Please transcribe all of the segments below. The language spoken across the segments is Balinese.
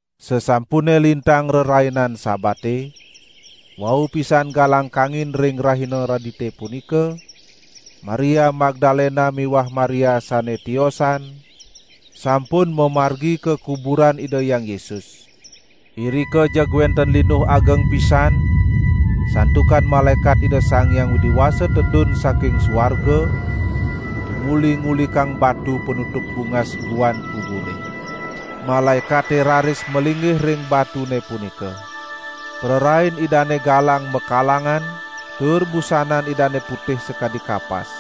Sasampune lintang Rerainan Sabate, wau pisan galang kangin ring rahina Redite punika, Maria Magdalena miwah Maria sane tiosan sampun mamargi ka kuburan Ida Hyang Yesus. Irika jeg wenten linuh ageng pisan santukan malaekat Ida Sang Hyang Widi Wasa tedun saking suarga tumuli ngulikang batu panutup bungas guan kubure. Malaekate raris malinggih ring batune punika. Prarain idane galang makalangan tur busanan idane putih sakadi kapas.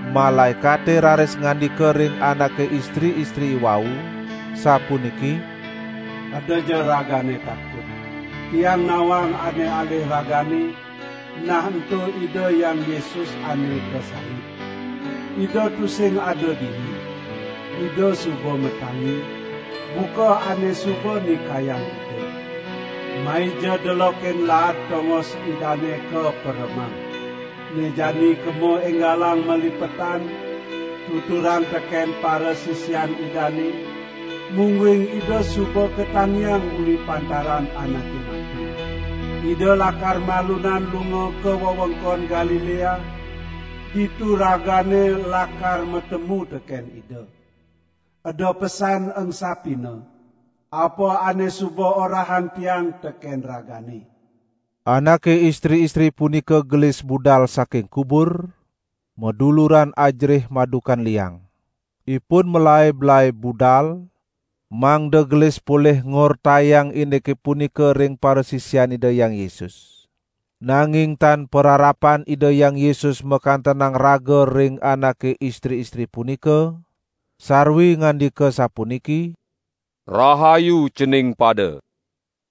Malaekate raris ngandika ring anake istri-istri iwau sapuniki: "Edaja ragane takut! Tiang nawang ane alih ragane, nah ento Ida Hyang Yesus ane kasalib. Ida tusing ada dini, Ida suba matangi, buka ane suba nikayang Ida. Maija delokin laad tongos Idane kaperemang. Ne jani kemo enggalang malipetan, tuturang teken parasisian Idane, mungguing Ida suba katangiang uli pantaran anake mati. Ida lakar malunan lunga ka wewengkon Galilea, ditu ragane lakar matemu teken Ida. Eda pesan engsapina, apa ane suba orahang tiang teken ragane." Anake istri-istri punika gelis budal saking kubur, maduluran ajerih madukan liang. Ipun malaib-laib budal mangda gelis polih ngortayang indike punika ring parasisian Ida Hyang Yesus. Nanging tan pararapan Ida Hyang Yesus makantenang raga ring anake istri-istri punika sarwi ngandika sapuniki: "Rahayu cening pada!"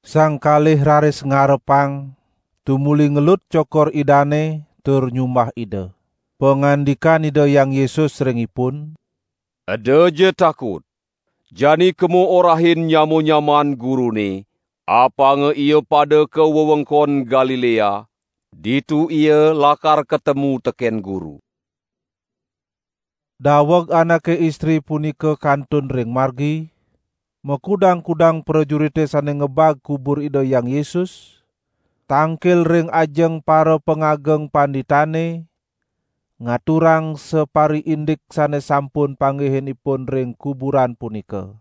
Sang kalih raris ngarepang tumuli ngelut cokor Idane tur nyumbah Ida. Pangandikan Ida Hyang Yesus ring ipun: "Edaja takut. Jani kemo orahin nyama-nyamaan Gurune apanga ia pada ka wewengkon Galilea, ditu ia lakar katemu teken Guru." Daweg anake istri punika kantun ring margi, makudang-kudang prajurite sane ngebag kubur Ida Hyang Yesus tangkil ring ajeng parapangageng panditane ngaturang sapariindik sane sampun panggihin ipun ring kuburan punika.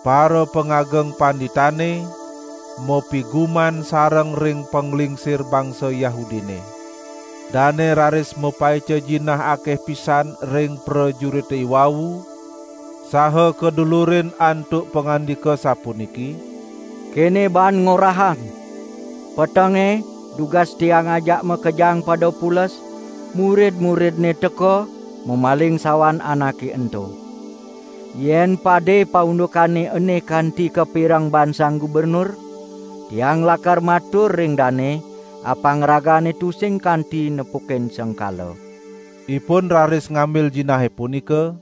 Parapangageng panditane mapiguman sareng ring panglingsir bangsa Yahudine. Dane raris mapaica jinah akeh pisan ring prajurite iwau, saha kadulurin antuk pangandika sapuniki: "Kene baan ngorahang: 'Petenge, dugas tiang ajak makejang pada pules, murid-muridNe teka mamaling sawan Anake ento.' Yen pade paundukane ene kanti kapireng baan sang gubernur, tiang lakar matur ring dane, apang ragane tusing kanti nepukin sengkala." Ipun raris ngambil jinahe punika,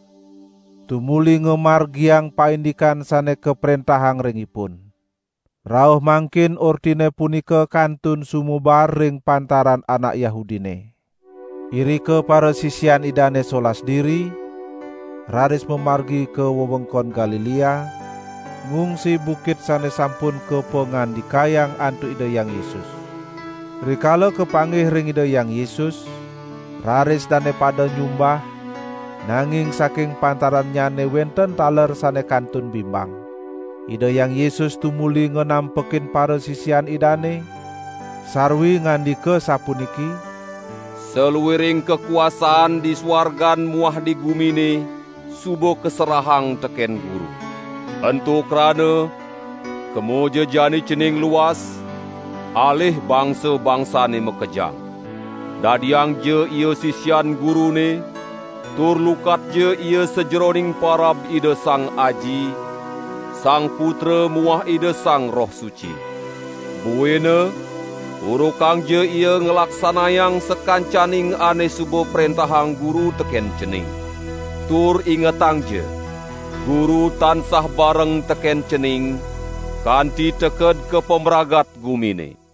tumuli ngamargiang paindikan sane kaprentahang ring ipun. Rauh mangkin ortine punika kantun sumebar ring pantaran anak Yahudine. Irika parasisian Idane solas diri raris mamargi ka wewengkon Galilea, ngungsi bukit sane sampun kapangandikayang antuk Ida Hyang Yesus. Rikala kapanggih ring Ida Hyang Yesus, raris dane pada nyumbah; nanging saking pantarannyane wenten taler sane kantun bimbang. Ida Hyang Yesus tumuli nganampekin parasisian Idane, sarwi ngandika sapuniki: "Saluiring kakuasaan di suargan muah di gumine suba kaserahang teken Guru. Ento krana, kemaja jani cening luas, alih bangsa-bangsane makejang. Dadiangja ia sisian Gurune, tur lukatja ia sajeroning parab Ida Sang Aji, Sang Putra muah Ida Sang Roh Suci. Buina urukangja ia nglaksanayang sakancaning ane suba prentahang Guru teken cening. Tur ingetangja, Guru tansah bareng teken cening kanti teked ka pamragat gumine."